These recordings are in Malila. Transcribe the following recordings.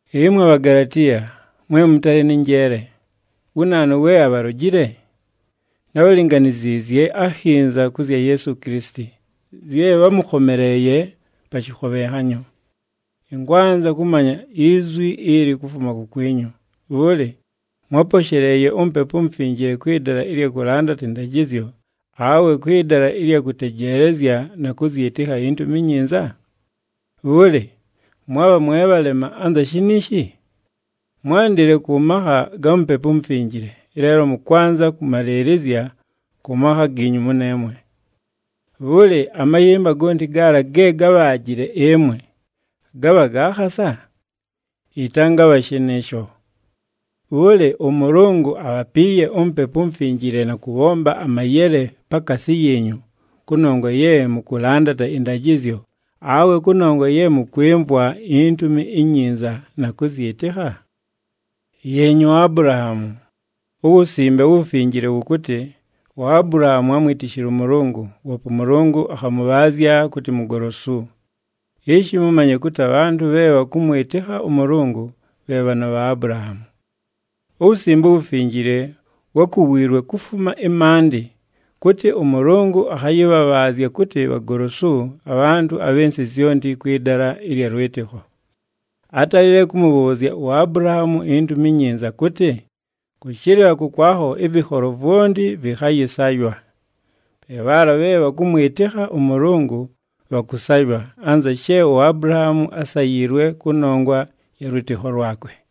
Ɨmwe Bhagalatiya, mwe mʉtalɨ nɨ njeele! Wu naanu, we abhalojile? Nábhalinganiziizye akhinza kʉ zya Yeesu Kilisiti, zye bhámʉkhomeleeye pa shɨkhobhenhanyo. Ɨnkwanza kʉmanya izwi ili kufuma kukwinyu, bhʉlɨ, mwáposheleeye uMupepu uMufinjile kwɨ dala ɨlya kʉlandata ɨndajɨzyo, awe kwɨ dala ɨlya kʉtejeelezya na kʉzyɨtɨkha iNtumi iNyinza? Bhʉlɨ, mwabha mwe bhalema anza shiniishi? Mwándile kʉ makha ga Mupepu uMufinjile, ɨleelo mʉkwanza kʉmalɨɨlɨzya kʉ makha giinyu mʉneemwe. Bhʉlɨ, amayɨmba gonti gaala ge gábhaajile ɨmwe, gabha ga khasa? Yɨtangabha shɨnɨɨsho! Bhʉlɨ, ʉMʉlʉngʉ abhapiiye uMupepu uMufinjile na kʉbhomba amayele pakaasi yiinyu, kʉnongwa ye mʉkʉlandata ɨndajɨzyo, awe kʉnongwa ye mʉkwɨmvwa iNtumi iNyinza na kʉzyɨtɨkha? Yeenyi uAbulahaamu. UWusimbe uWufinjile wʉkʉtɨ, “UAbulahaamu ámwitishile ʉMʉlʉngʉ, woope ʉMʉlʉngʉ akhamʉbhaazya kʉtɨ mugolosu.” Ishi mʉmanye kʉtɨ abhantʉ bhe bhakʉmwɨtɨkha ʉMʉlʉngʉ bhe bhaana bha Abulahaamu. UWusimbe uWufinjile wákuwiilwe kufuma ɨmaandɨ kʉtɨ ʉMʉlʉngʉ akhayɨbhabhaazya kʉtɨ bhagolosu abhantʉ abhɨ nsɨ zyonti kwɨ dala ɨlya lwɨtɨkho. Átalile kʉmʉbhʉʉzya uAbulahaamu iNtumi iNyinza kʉtɨ, “Kʉshɨlɨla kʉkwakho ɨvɨkholo vwonti vɨkhayɨsaywa.” Pe bhaala bhe bhakʉmwɨtɨkha ʉMʉlʉngʉ bhakʉsaywa, anza she uAbulahaamu ásayiilwe kʉnongwa ya lwɨtɨkho lwakwe.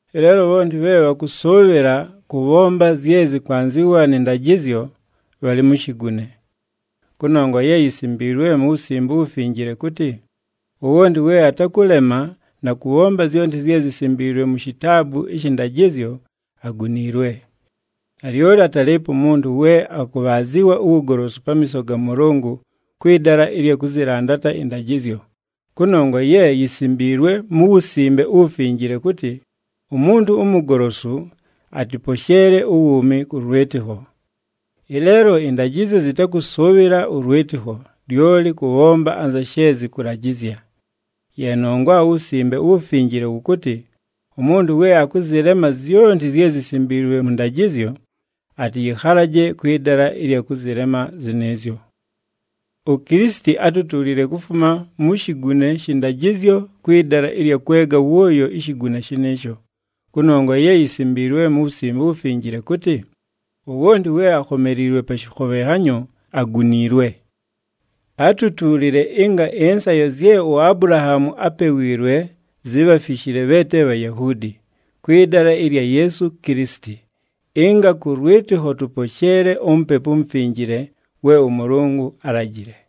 Ɨleelo bhonti bhe bhakʉsʉʉbhɨla kʉbhomba zye zɨkwanzɨwa nɨ ndajɨzyo, bhalɨ mu shigune. Kʉnongwa ye yisimbiilwe mu Wusimbe uWufinjile kʉtɨ, “Wowonti we atakʉlema na kʉbhomba zyonti zye zisimbiilwe mu Shitaabu ɨshɨ ndajɨzyo, aguniilwe.” Nalyoli atalɨɨpo umuntu we akʉbhaazɨwa uwugolosu pamiiso ga Mʉlʉngʉ kwɨ dala ɨlya kʉzɨlandata ɨndajɨzyo, kʉnongwa ye yisimbiilwe mu Wusimbe uWufinjile kʉtɨ, “Umuntu umugolosu atɨposheele uwuumi kʉ lwɨtɨkho.” Ɨleelo ɨndajɨzyo zɨtakʉsʉʉbhɨla ʉlwɨtɨkho, lyoli kʉbhomba anza she zɨkʉlajɨzya. Ye nongwa uWusimbe uWufinjile wʉkʉtɨ, “Umuntu we akʉzɨlema zyonti zye zisimbiilwe mʉ ndajɨzyo, atɨyɨkhalaje kwɨ dala ɨlya kʉzɨlema zɨnɨɨzyo.” UKilisiti átutuulile kufuma mu shigune shɨ ndajɨzyo kwɨ dala ɨlya kwega wʉʉyo ishigune shɨnɨɨsho, kʉnongwa ye yisimbiilwe mu Wusimbe uWufinjile kʉtɨ, “Wowonti we akhomeliilwe pa shɨkhobhenhanyo aguniilwe.” Átutuulile ɨnga ɨnsayo zye uAbulahaamu ápewiilwe, zibhafishile bhe te Bhayahuudi, kwɨ dala ɨlya Yeesu Kilisiti, ɨnga kʉ lwɨtɨkho tʉposheele uMupepu uMufinjile we ʉMʉlʉngʉ álajile.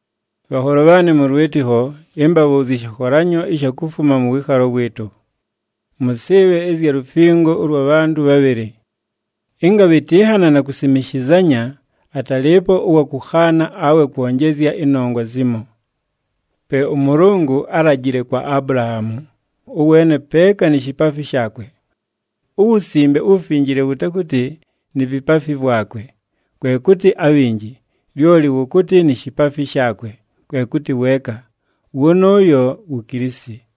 Bhanholo bhaanɨ mʉ lwɨtɨkho, ɨmbabhʉʉzye ɨshɨkholanyo ɨsha kufuma mʉ wɨɨkhalo wɨɨtʉ. Mʉsɨɨbhe ɨzya lufingo ʉlwa bhantʉ bhabhɨlɨ. Ɨnga bhɨtɨnhana na kusimishizanya, atalɨɨpo ʉwa kʉkhaana awe kwonjezya ɨnongwa zimo. Pe ʉMʉlʉngʉ álajile kwa Abulahaamu, ʉweene peeka ni shipaafi shaakwe. UWusimbe uWufinjile wʉtakʉtɨ, “Ni vipaafi vwakwe,” kwe kʉtɨ abhinji, lyoli wʉkʉtɨ, “Ni shipaafi shaakwe,” kwe kʉtɨ weeka, wʉnʉʉyo wu Kilisiti.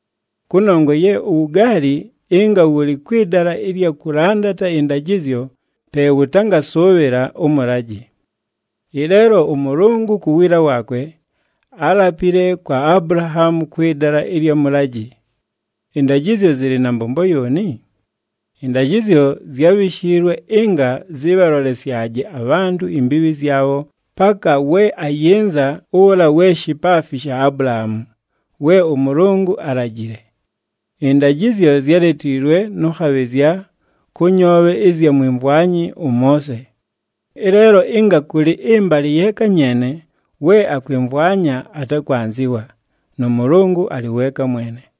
Kʉnongwa ye uwugaali ɨnga wʉlɨ kwɨ dala ɨlya kʉlandata ɨndajɨzyo, pe wʉtangasʉʉbhɨla ʉmʉlajɨ. Ɨleelo ʉMʉlʉngʉ ku wiila waakwe, álapile kwa Abulahaamu kwɨ dala ɨlya mʉlajɨ. Ɨndajɨzyo zɨlɨ na mbombo yooni? Ɨndajɨzyo zyábhishiilwe ɨnga zɨbhalolesyaje abhantʉ imbiibhi zyabho, paka we ayɨnza ʉla we shipaafi sha Abulahaamu, we ʉMʉlʉngʉ álajile. Ɨndajɨzyo zyáletiilwe nʉ khabhɨzya, kʉ nyoobhe ɨzya mwimvwanyi ʉMoose. Ɨleelo ɨnga kʉlɨ ɨmbalɨ yeeka nyeene, we akwɨmvwanya atakwanzɨwa, nʉ Mʉlʉngʉ alɨ weeka mwene.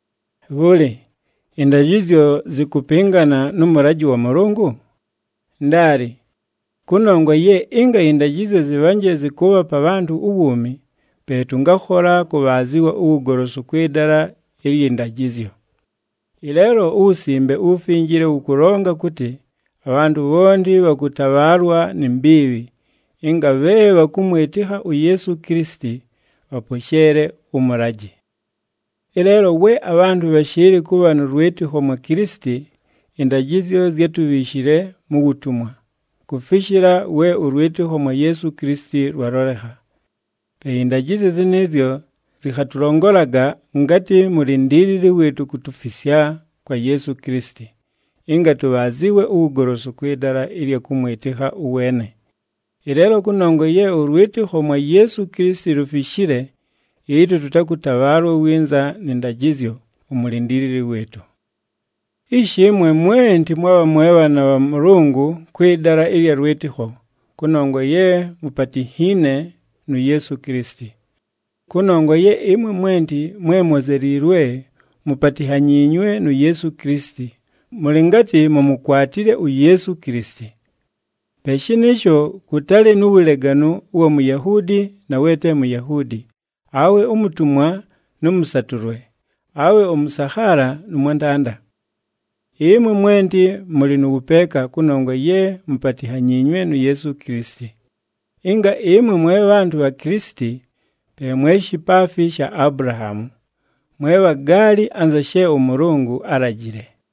Bhʉlɨ, ɨndajɨzyo zɨkʉpɨngana nʉ mʉlajɨ wa Mʉlʉngʉ? Ndaali! Kʉnongwa ye ɨnga ɨndajɨzyo zɨbhanje zɨkʉʉbhapa abhantʉ uwuumi, pe tʉngakhola kʉbhaazɨwa uwugolosu kwɨ dala ɨlyɨ ndajɨzyo. Ɨleelo uWusimbe uWufinjile wʉkʉlonga kʉtɨ abhantʉ bhonti bhakʉtabhaalwa ni mbiibhi, ɨnga bhe bhakʉmwɨtɨkha uYeesu Kilisiti bhaposheele ʉmʉlajɨ. Ɨleelo we abhantʉ bhashɨɨlɨ kʉbha nʉ lwɨtɨkho mwa Kilisiti, ɨndajɨzyo zyátubhiishile mu wutumwa, kufishila we ʉlwɨtɨkho mwa Yeesu Kilisiti lwalolekha. Pe ɨndajɨzyo zɨnɨɨzyo zɨkhatʉlongolaga ngatɨ mulindiilili wɨɨtʉ kutufisya kwa Yeesu Kilisiti, ɨnga tʉbhaazɨwe uwugolosu kwɨ dala ɨlya kʉmwɨtɨkha ʉweene. Ɨleelo kʉnongwa ye ʉlwɨtɨkho mwa Yeesu Kilisiti lufishile, ɨtwe tʉtakʉtabhaalwa winza nɨ ndajɨzyo, umulindiilili wɨɨtʉ. Ishi ɨmwe mwenti mwabha mwe bhaana bha Mʉlʉngʉ, kwɨ dala ɨlya lwɨtɨkho, kʉnongwa ye mupatinhiine nu Yeesu Kilisiti. Kʉnongwa ye ɨmwe mwenti mwe mwozeliilwe, mupatinhanyiinywe nu Yeesu Kilisiti, mʉlɨ ngatɨ mumukwatile uYeesu Kilisiti. Pe shɨnɨɨsho kʉtalɨ nu wuleganu ʉwa Muyahuudi na we te Muyahuudi, awe umutumwa nʉ mʉsatʉlwe, awe ʉmʉsakhaala nʉ mwantanda. Ɨmwe mwenti mʉlɨ nʉ wʉpeeka, kʉnongwa ye mupatinhanyiinywe nu Yeesu Kilisiti. Ɨnga ɨmwe mwe bhantʉ bha Kilisiti, pe mwe shipaafi sha Abulahaamu, mwe bhagaali anza she ʉMʉlʉngʉ álajile.